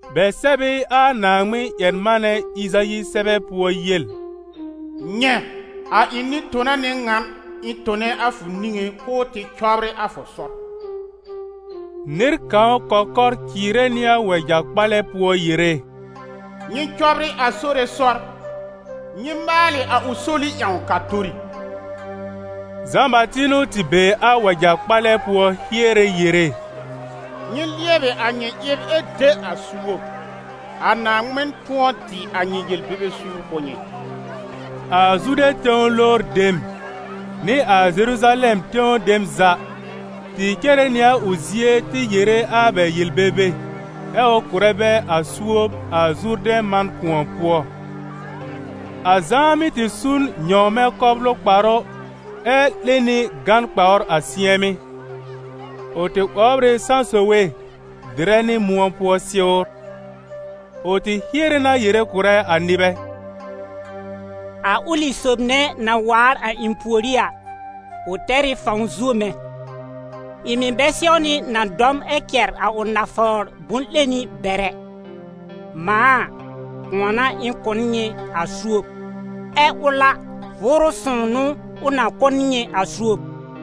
Bɛ sɛb ɩ a Naaŋmɩn-ƴɛr-manɛ Ɩzayi sɛbɛ pʋɔ yel: «Nyɛ̃, a ɩ̃ nɩ-tona n'ɩ ŋan ɩ̃ tone a fʋ niŋé k'ʋʋ tɩ cɔbrɩ a fʋ sɔr.» Nɩr kãw kɔkɔr cɩɩrɛ nɩ a wɛja-kpalɛ pʋɔ yere: «Nyɩ cɔbrɩ a Sore sɔr, nyɩ maalɩ a ʋ soli ƴãw k'a tori.» Zã-Bati n'ʋ tɩ be a wɛja-kpalɛ pʋɔ hiere yere: «Nyɩ lɩɛbɩ a nyɩ ɩb ɛ de a suob, a Naaŋmɩn tʋ̃ɔ dɩ a nyɩ yel-bebe suur kʋ̀ nyɩ.» A Zude tẽw lowr dem, nɩ a Zeruzalɛm tẽw dem za, tɩ cere nɩ a ʋ zie tɩ yere a bɛ yel-bebe, ɛ ʋ kʋ̀rɛ bɛ a suob a Zurdɛ̃ man kʋ̃ɔ pʋɔ. A Zã mɩ́ tɩ su n nyɔ̃wmɛ̃ kɔblʋ kparʋ ɛ 'lẽ nɩ gán kpawr a sɩ̃ɛmɩ́; ʋ tɩ 'wɔbr ɩ sãsowe dɩrɛ nɩ mʋ̃ɔ pʋɔ sɩwr. Ʋ tɩ hiere na yere kʋ̀rɛ a nɩbɛ: «A ʋlɩ sob nɛ na waar a ɩ̃ pùorí a, ʋ tɛr ɩ fãw zuo mɛ̃. Ɩ̃ mɩ̀ bɛ sɛwnɩ na dɔm ɛ cɛ̀r a ʋ nafawr bʋ̃-'leni bɛr ɛ. Mãa a, kʋ̃ɔ n'a ɩ̃ kʋ̀ n nyɩ a suob, ɛ ʋl a, Vʋʋrʋ Sõw n'ʋ ʋ na kʋ̀ n nyɩ a suob.»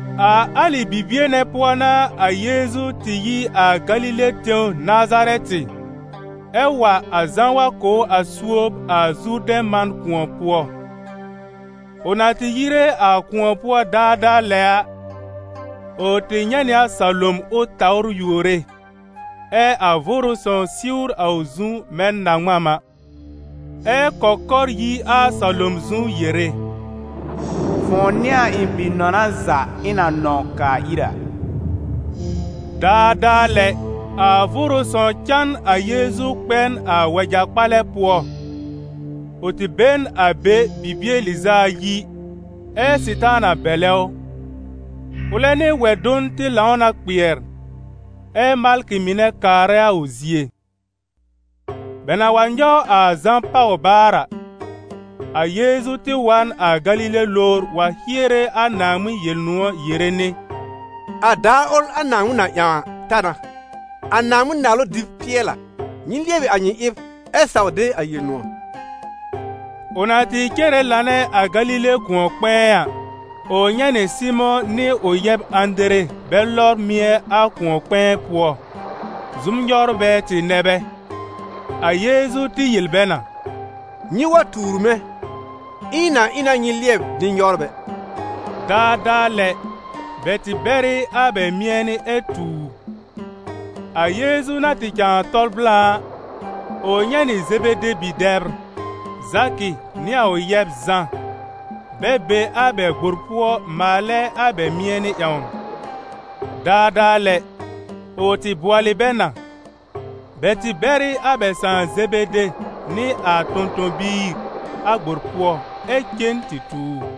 A alɩ bibie nɛ pʋɔ n'a a Yeezu tɩ yi a Galile tẽw Nazarɛtɩ, ɛ wa a Zã wa kʋ̀ ʋ a suob a Zurdɛ̃ man kʋ̃ɔ pʋɔ. Ʋ na tɩ yire a kʋ̃ɔ pʋɔ daadaa lɛ a, ʋ tɩ nyɛ̃ nɩ a salom ʋ tawr yuore, ɛ a Vʋʋrʋ Sõw siwr a ʋ zu mɛ̃ na-ŋmam a, ɛ kɔkɔr yi a salom zu yere: «Fʋ̃ʋ n'ɩ a ɩ̃ Bi-nɔna za, ɩ̃ na nɔ̃w kaa ir a.» Daadaa lɛ, a Vʋʋrʋ Sõw cã n a Yeezu kpɛ n a wɛja-kpalɛ pʋɔ. Ʋ tɩ be n a be bibie lɩz'a ayi, ɛ́ Sɩtaana bɛlɛ ʋ. Ʋlɛ nɩ wɛ-dʋn tɩ lãw na kpɩɛr, ɛ́ malkɩ mɩnɛ kaarɛ a ʋ zie. Bɛ na wa nyɔw a Zã pàw baar a, a Yeezu tɩ wa n a Galile lowr wa hiere a Naaŋmɩn Yel-nʋ̃ɔ̀ yere nɩ: «A daar ʋl a Naaŋmɩn na ƴãw a, ta na, a Naaŋmɩn-Naalʋ dɩb pɩɛl a: nyɩ lɩɛbɩ a nyɩ ɩb ɛ saw de a Yel-nʋ̃ɔ̀.» Ʋ na tɩ cere lanɛ a Galile kʋ̃ɔ-kpɛ̃ɛ a, ʋ nyɛ̃ nɩ Sɩmʋ̃ nɩ ʋ yɛb Ãdere bɛ lɔbr mɩ̃ɛ a kʋ̃ɔ-kpɛ̃ɛ pʋɔ: zʋm-nyɔwrbɛ tɩ nɛ bɛ. A Yeezu tɩ yel bɛ na: «Nyɩ wa tuur mɛ̃, ɛ ɩ̃ na ɩ na nyɩ lɩɛb nɩ-nyɔwrbɛ.» Daadaa lɛ, bɛ tɩ bɛr ɩ a bɛ mɩ̃ɛnɩ ɛ tu ʋ. A Yeezu na tɩ cãa tɔl blã a, ʋ nyɛ̃ nɩ Zebede bi-dɛbr, Zakɩ nɩ a ʋ yɛb Zã, bɛ be a bɛ gbor pʋɔ maalɛ a bɛ mɩ̃ɛnɩ ƴãwn. Daadaa lɛ, ʋ tɩ bʋɔlɩ bɛ na. Bɛ tɩ bɛr ɩ a bɛ sãà Zebede nɩ a tõ-tõ-biir a gbor pʋɔ ɛ cen tɩ tu ʋ.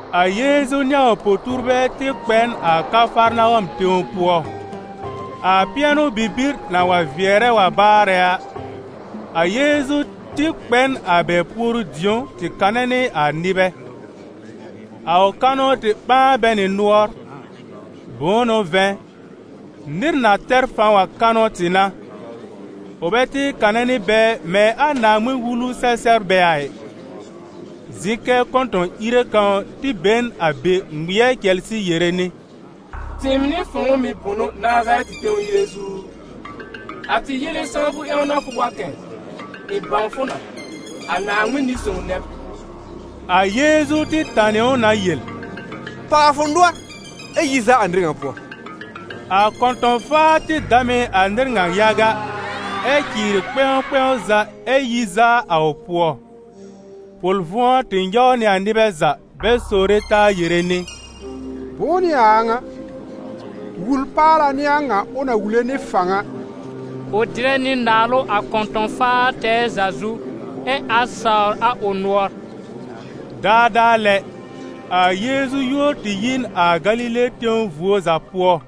A Yeezu nɩ a ʋ po-tuurbɛ tɩ kpɛ n a Kafarnawɔm tẽw pʋɔ. A pɩɛnʋ-bibir na wa vɩɛrɛ wa baarɛ a, a Yeezu kpɛ n a bɛ puoru-dĩ̀ó tɩ kanɛ nɩ a nɩbɛ. A ʋ kanʋ tɩ ɓãa bɛ nɩ nʋɔr; bʋ̃ʋ n'ʋ vɛ̃, nɩr na tɛr fãw a kanʋ tɩ n'a, ʋ bɛ tɩ kanɛ nɩ bɛ mɛ̃ a Naaŋmɩn-Wulu-sɛ-sɛbrbɛ a ɩ. Zɩ̃ kɛ kɔ̃tɔ̃-ìre kãw tɩ be n a be ŋmɩɛr cɛlsɩ yere nɩ: «Tɩɩm nɩ fʋ̃ʋ mɩ̀ bʋnʋ Nazarɛtɩ tẽw Yeezu u? A tɩ yele sãwfʋ ƴãw n'a fʋ wa kɛ̃! Ɩ̃ bãw fʋ na: a Naaŋmɩn Nɩ-sõw nɛ b!» A Yeezu tɩ tanɩ ʋ na yel: «Pàw a fʋ nʋɔr ɛ yi zaa a nɩr ŋa pʋɔ!» A kɔ̃tɔ̃-faa tɩ dam ɩ a nɩr ŋa yaga, ɛ cɩɩrɩ kpɛ̃w kpɛ̃w za ɛ yi zaa a ʋ pʋɔ. Pʋl-vʋ̃ɔ tɩ nyɔw nɩ a nɩbɛ za bɛ sowre taa yere nɩ: «Bʋ̃ʋ n'ɩ a a ŋa? Wul-paala n'ɩ a ŋa ʋ na wule nɩ fãw a! Ʋ dɩrɛ nɩ naalʋ a kɔ̃tɔ̃-faar tɛɛ za zu, ɛ a sawr a ʋ nʋɔr.» Daadaa lɛ, a Yeezu yúor tɩ yi n a Galile tẽw vuo za pʋɔ.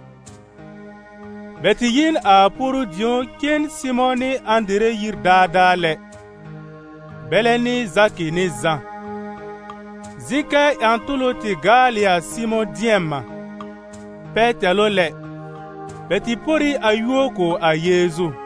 Bɛ tɩ yi n a puoru-dĩ̀ó cen Sɩmʋ̃ nɩ Ãdere yir daadaa lɛ, bɛlɛ nɩ Zakɩ nɩ Zã. Zɩ̃ kɛ ƴã-tʋlʋ tɩ gaal ɩ a Sɩmʋ̃ dɩɛm-mã; pɛtɛlʋ lɛ, bɛ tɩ por ɩ a yúor kʋ̀ a Yeezu.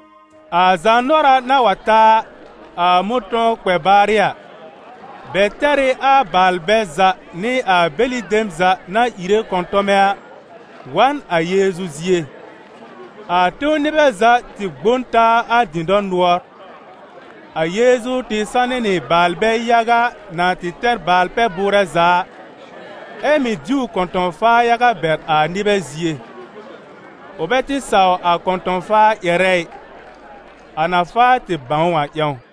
A zaanʋɔra na wa ta a, a mʋ̃tɔ̃w kpɛ baarɩ a, bɛ tɛr ɩ a baalbɛ za nɩ a bɛlɩ dem za na ìre kɔ̃tɔmɛ a, wa n a Yeezu zie. A tẽw nɩbɛ za tɩ gbõ n taa a dɩ̃dɔr nʋɔr. A Yeezu tɩ sanɩ nɩ baalbɛ yaga na tɩ tɛr baal-pɛ-bʋʋrɛ za a, ɛ mɩ̀ diw kɔ̃tɔ̃-faar yaga bɛr a nɩbɛ zie. Ʋ bɛ tɩ saw a kɔ̃tɔ̃-faar ƴɛrɛ ɩ, a na faa tɩ bãw ʋ a ƴãw.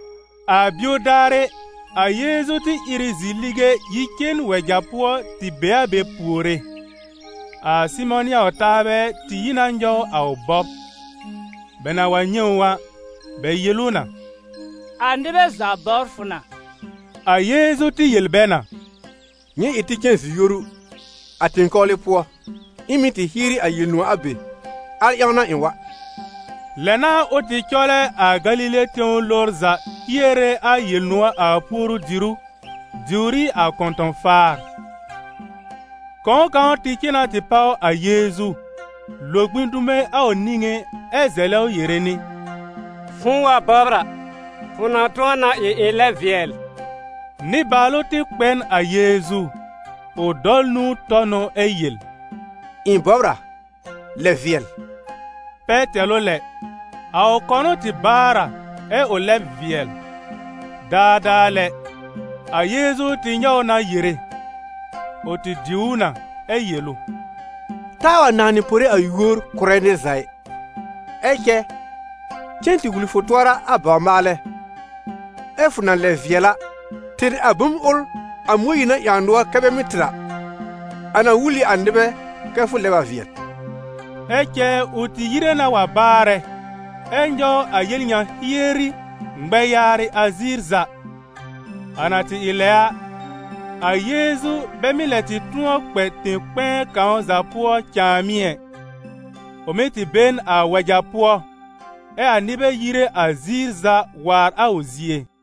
A bio daarɩ, a Yeezu tɩ ìr ɩ zi-lige yi cen wɛja pʋɔ tɩ be a be puore. A Sɩmʋ̃ nɩ a ʋ taabɛ tɩ yi na nyɔw a ʋ bɔb. Bɛ na wa nyɛ̃ ʋ a, bɛ yel ʋ na: «A nɩbɛ za bɔbr fʋ na.» A Yeezu tɩ yel bɛ na: «Nyɩ ɩ tɩ cen zi-yoru, a tẽ-kpɔwlɩ pʋɔ, ɩ̃ mɩ̀ tɩ hieri a Yel-nʋ̃ɔ̀ a be, al ƴãw n'a ɩ̃ wa.» Lɛ n'a ʋ tɩ cɔlɛ a Galile tẽw lowr za hiere a Yel-nʋ̃ɔ̀ a puoru-dìrú, diwr ɩ a kɔ̃tɔ̃-faar. Kɔ̃w kãw tɩ cen na tɩ páw a Yeezu, lo gbĩ dume a ʋ niŋé ɛ zɛlɛ ʋ yere nɩ: «Fʋ̃ʋ wa bɔbr a, fʋ na tʋ̃ɔ na ɩ ɩ̃ lɛb vɩɛl.» Nɩbaalʋ tɩ kpɛ n a Yeezu, ʋ dɔl nũu tɔ n ʋ ɛ yel: «Ɩ̃ bɔbr a, lɛb vɩɛl.» Pɛtɛlʋ lɛ, a ʋ kɔnʋ tɩ baar a, ɛ ʋ lɛb vɩɛl. Daadaa lɛ, a Yeezu tɩ nyɔw ʋ na yere. Ʋ tɩ diw ʋ na, ɛ yel ʋ: «Taa wa nãnɩ pore a yúor kʋ̀rɛ nɩr za ɩ, ɛ cɛ cen tɩ wul fʋ tʋɔra a bawr-maalɛ; ɛ́ fʋ na lɛb vɩɛl a, tɩr a bom ʋl a Mõyiir na ƴãw nʋɔr kɛ bɛ mɩ́ tɩr a, a na wul ɩ a nɩbɛ kɛ fʋ lɛb a vɩɛl.» Ɛ cɛ ʋ tɩ yire na wa baarɛ, ɛ nyɔw a yel ŋa hieri, ŋmɛ yaarɩ a ziir za. A na tɩ ɩ lɛ a, a Yeezu bɛ mɩ́ lɛ tɩ tʋ̃ɔ kpɛ tẽ-kpɛ̃ɛ kãw za pʋɔ cãàmɩ́ ɛ. Ʋ mɩ́ tɩ be n a wɛja pʋɔ, ɛ a nɩbɛ yire a ziir za waar a ʋ zie.